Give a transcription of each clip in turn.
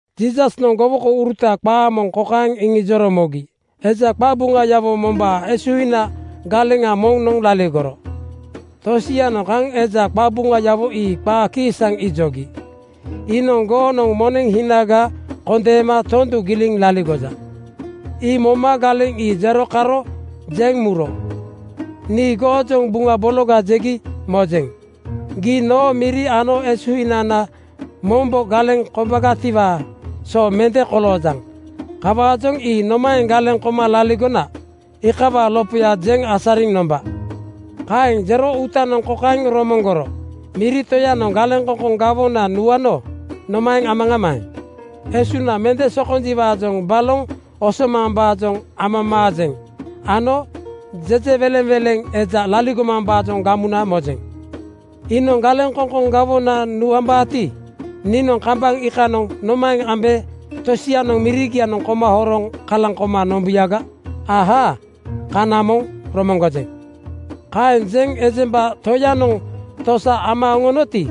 Jiisasnoŋ gowokouruta qaa moŋ kokaeŋ iŋijoro mogi, “Eja qabuŋayawo mombaa esuhina galeŋa moŋ laligoro. Tosianoŋ kaŋ eja qabuŋayawo ii qaa kiisaŋ ijogi, ‘Iinoŋ goonoŋ moneŋ hinaga kondeema tondu giliŋ laligoja.’ Ii moma galeŋ ii jero karo jeŋ muro, ‘Nii goojoŋ buŋa bologa jegi mojeŋ. Gii noo miri ano esuhinana mombo galeŋ kombagatiwaa so mende koloojaŋ. Kawaajoŋ ii nomaeŋ galeŋ koma laligona, iikawaa lopoya jeŋ asariŋ nomba.’ Kaeŋ jero uutanoŋ kokaeŋ romoŋgoro, ‘Miri toyanoŋ galeŋkoŋkoŋ gawona nuano nomaeŋ amaŋamaeŋ? Esuŋna mende sokonjiwaajoŋ baloŋ osomambaajoŋ amamaajeŋ ano jejewelenweleŋ eja laligomambaajoŋ gamuna mojeŋ. Iinoŋ galeŋkoŋkoŋ gawona nuambaati, niinoŋ kambaŋ iikanoŋ nomaeŋ ambe tosianoŋ mirigianoŋ koma horoŋ kalaŋ koma nombuyaga? Ahaa! Kana moŋ romoŋgojeŋ.’ “Kaeŋ jeŋ ejemba toyanoŋ tosa ama oŋonoti,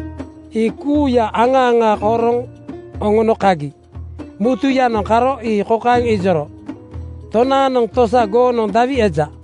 ii kuuya aŋa aŋa horoŋ oŋono kagi. Mutuyanoŋ karo ii kokaeŋ ijoro, ‘Tonaanoŋ tosa goonoŋ dawi eja?’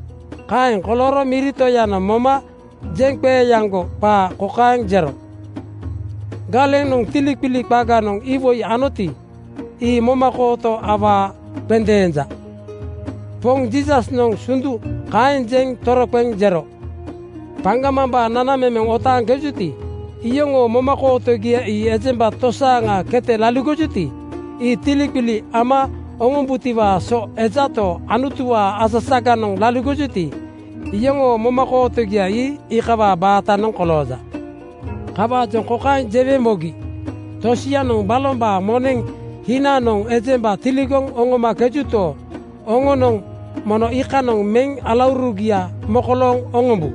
“Kaeŋ kolooro miri toyanoŋ moma jeŋqeeaŋgo qaa kokaeŋ jero, ‘Galenanoŋ tiliqili qaganoŋ iwoi anoti, ii momakooto awaa qendeenja.’” Poŋ Jiisasnoŋ sundu kaeŋ jeŋ toroqeŋ jero, “Paŋgamambaa nanamemeŋ otaaŋkejuti, iyoŋoo momakootogia ii ejemba tosaaŋa kete laligojuti, ii tiliqili ama oŋombutiwaa so ejato, Anutuwaa asasaganoŋ laligojuti, yoŋoo momakootogia ii iikawaa baatanoŋ kolooja. “Kawaajoŋ kokaeŋ jewe mogi: Tosianoŋ balombaa moneŋ hinanoŋ ejemba tiligoŋ oŋomakejuto, oŋonoŋ mono iikanoŋ meŋ alaurugia mokolooŋ oŋombu.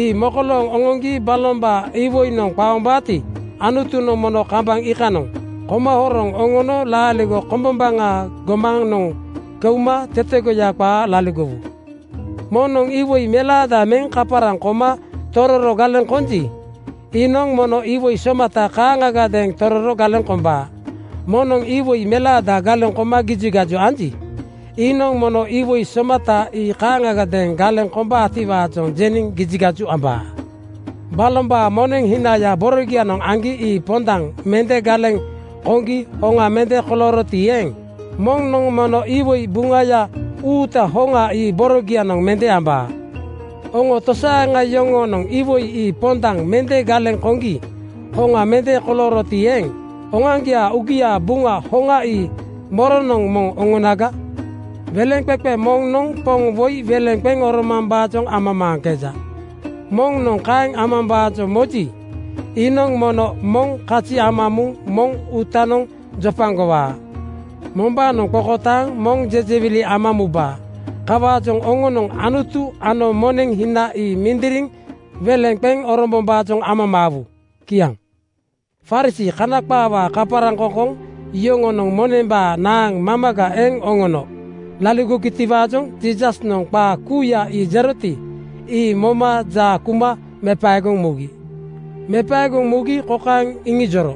Ii mokolooŋ oŋoŋgi balombaa iwoinoŋ qaombaati, Anutunoŋ mono kambaŋ iikanoŋ koma horoŋ oŋono laaligo kombombaŋaa gomanoŋ keuma tetegoya qaa laligowu. “Moŋnoŋ iwoi melaada meŋ kaparaŋ koma tororo galeŋ konji, iinoŋ mono iwoi somata kaaŋagadeeŋ tororo galeŋ kombaa. Moŋnoŋ iwoi melaada galeŋ koma gijigaju anji, iinoŋ mono iwoi somata ii kaaŋagadeeŋ galeŋ kombaatiwaajoŋ jeniŋ gijigaju ambaa. Balombaa moneŋ hinaya borogianoŋ aŋgi ii pondaŋ mende galeŋ koŋgi hoŋa mende kolooroti eeŋ, moŋnoŋ mono iwoi buŋaya uuta hoŋa ii borogianoŋ mende ambaa. Oŋo tosaaŋa yoŋoonoŋ iwoi ii pondaŋ mende galeŋ koŋgi hoŋa mende kolooroti eeŋ, oŋoaŋgiaa uugiaa buŋa hoŋa ii moronoŋ moŋ oŋonaga? “Weleŋqeqe moŋnoŋ poŋ woi weleŋ qeŋ oromambaajoŋ amamaaŋkeja. Moŋnoŋ kaeŋ amambaajoŋ moji, iinoŋ mono moŋ kazi ama muŋ moŋ uutanoŋ jopagowaa. Mombaanoŋ qokotaaŋ moŋ jejewili ama mubaa. Kawaajoŋ oŋonoŋ Anutu ano moneŋ hina ii mindiriŋ weleŋ qeŋ orombombaajoŋ amamaawu.” Kiaŋ. Farisii (Kana qaawaa kaparaŋkoŋkoŋ) yoŋonoŋ monembaa naaŋ mamaga eŋ oŋono laligogitiwaajoŋ Jiisasnoŋ qaa kuuya ii jeroti, ii moma jaa kuma mepaegoŋ mugi. Mepaegoŋ mugi kokaeŋ iŋijoro,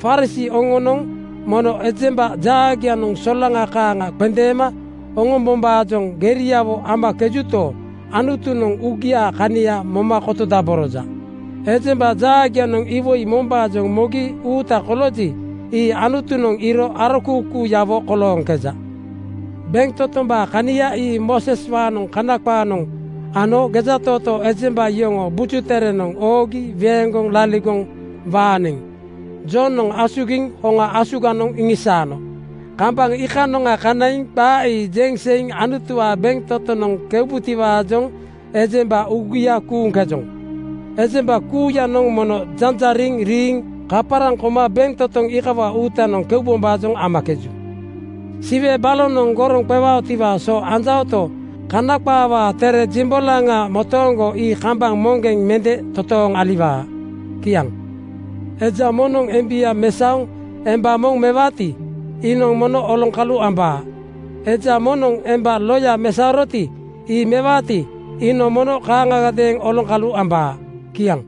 “Farisii oŋonoŋ mono ejemba jaagianoŋ solaŋa kaaŋa qendeema oŋombombaajoŋ geriawo amakejuto, Anutunoŋ uugiaa kania moma kotodaboroja. Ejemba jaagianoŋ iwoi mombaajoŋ mogi uuta kolooji, ii Anutunoŋ iiro arokuukuuyawo kolooŋkeja. “Bentotombaa kania ii Mooseswaanoŋ Kana qaanoŋ ano gejatootoo ejemba yoŋoo Buju Terenoŋ oogi weeŋgoŋ laligoŋ waaniŋ Jonoŋ asugiŋ hoŋa asuganoŋ iŋisaano. Kambaŋ iikanoŋa kanaiŋ qaa ii jeŋ seiŋ Anutuwaa bentotonoŋ keubutiwaajoŋ ejemba uugia kuuŋkejoŋ. Ejemba kuuyanoŋ mono janjariŋ riiŋ kaparaŋ koma bentotoŋ iikawaa uutanoŋ keubombaajoŋ amakeju. Siwe balonoŋ goroŋ qewaotiwaa so anjaoto, Kana qaawaa tere jimbolaŋa motooŋgo ii kambaŋ moŋgeŋ mende totooŋ aliwaa. Kiaŋ. “Eja moŋnoŋ embia mesaoŋ emba moŋ mewaati, iinoŋ mono oloŋkalu ambaa. Eja moŋnoŋ emba loyanoŋ mesaoroti, ii mewaati, iinoŋ mono kaaŋagadeeŋ oloŋkalu ambaa.” Kiaŋ.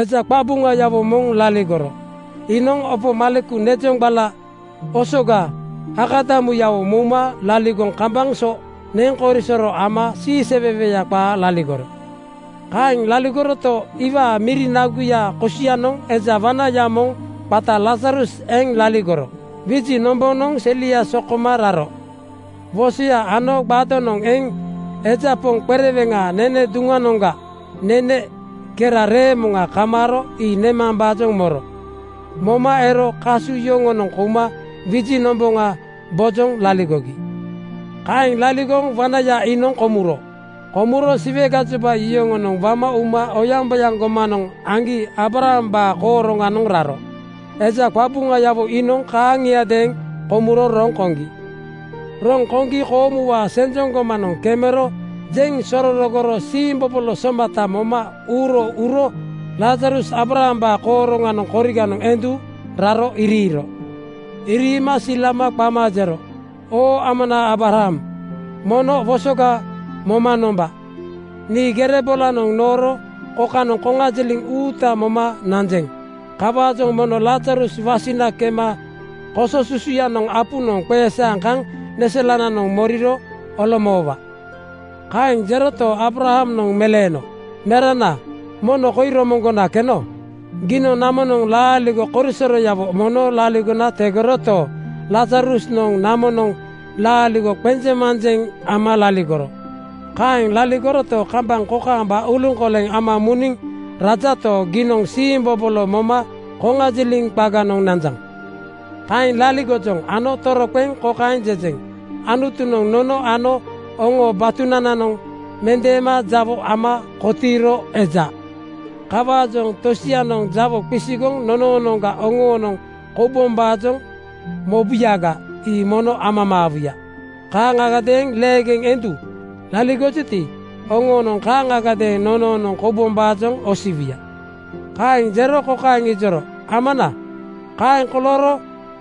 “Eja qabuŋayawo moŋ laligoro. Iinoŋ opo maleku nezoŋgbala osoga akadamuyawo mouma laligoŋ kambaŋ so neŋkorisoro ama siiseweweya qaa laligoro. Kaeŋ laligoroto, iwaa miri naguya kosianoŋ eja wanaya moŋ qata Lazarus eŋ laligoro. Wiji nombonoŋ selia so koma raro. Wosoya ano gbadonoŋ eŋ eja poŋ qereweŋaa nene duŋnoŋga nene kera reemoŋa kamaaro ii nemambaajoŋ moro. Moma ero kasu yoŋonoŋ kouma wiji nomboŋa bojoŋ laligogi. “Kaeŋ laligoŋ wanaya iinoŋ komuro. Komuro Siwe gajoba yoŋonoŋ wama uma oyaŋboyaŋ gomanoŋ aŋgi Aabrahambaa kooroŋanoŋ raro. Eja qabuŋayawo iinoŋ kaaŋiadeeŋ komuro roŋ koŋgi. Roŋ koŋgi koomuwaa senjoŋ gomanoŋ kemero jeŋ sorogoro siimbobolo somata moma uuro uro Lazarus Aabrahambaa kooroŋanoŋ koriganoŋ endu raro iriiro. Iriima silama qama jero, ‘Oo amana Aabraham, mono wosoga moma nomba. Nii gere bolanoŋ nooro kokanoŋ koŋajiliŋ uuta moma nanjeŋ. Kawaajoŋ mono Lazarus wasina kema koso susuyanoŋ apunoŋ qeesaaŋ kaŋ neselananoŋ moriro olomoowa.’ “Kaeŋ jeroto, Aabrahamnoŋ meleeno, ‘Merana, mono koi romoŋgona keno. Giinoŋ namonoŋ laaligo korisoroyawo mono laligona tegoroto, Lazarusnoŋ namonoŋ laaligoya qenjeŋmanjeŋ ama laligoro. Kaeŋ laligoroto, kambaŋ kokaamba uluŋkoleŋ ama muniŋ rajato, giinoŋ siimbobolo moma koŋajiliŋ qaganoŋ nanjaŋ. Kaeŋ laligojoŋ ano toroqeŋ kokaeŋ jejeŋ: Anutunoŋ nono ano oŋo batunananoŋ mendeema jawo ama kotiiro eja. Kawaajoŋ tosianoŋ jawo qisigoŋ nonoonoŋga oŋoonoŋ koubombaajoŋ mobuyaga, ii mono amamaawuya. Kaaŋagadeeŋ leegeŋ endu laligojuti, oŋonoŋ kaaŋagadeeŋ nonoonoŋ koubombaajoŋ osiwuya.’ Kaeŋ jero kokaeŋ ijoro, ‘Amana, kaeŋ kolooro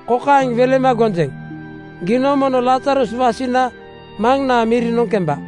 kokaeŋ welema gonjeŋ: Giinoŋ mono Lazarus wasina maŋnaa mirinoŋ kemba.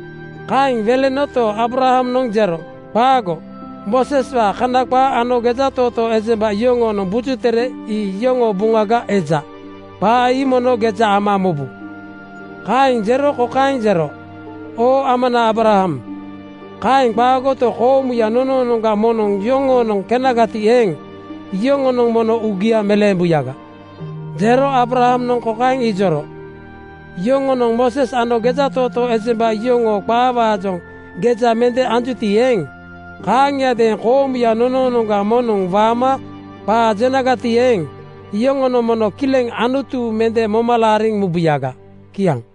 “Kaeŋ welenoto, Aabrahamnoŋ jero, ‘Qaago! Mooseswaa Kana qaa ano gejatootoo ejemba yoŋoonoŋ Buju Tere ii yoŋoo buŋaga eja. Qaa ii mono geja ama mobu!’ Kaeŋ jero kokaeŋ jero, ‘Oo ama Aabraham, kaeŋ qaagoto, koomuya nonoonoŋga moŋnoŋ yoŋoonoŋ kenagati eeŋ, yoŋonoŋ mono uugia meleembuyaga.’ Jero Aabrahamnoŋ kokaeŋ ijoro, ‘Yoŋonoŋ Mooses ano gejatootoo ejemba yoŋoo qaawaajoŋ geja mende anjuti eeŋ, kaaŋiadeeŋ koomuya nonoonoŋga moŋnoŋ waama qaa jenagati eeŋ, iyoŋonoŋ mono kileŋ Anutu mende moma laariŋ mubuyaga.’” Kiaŋ.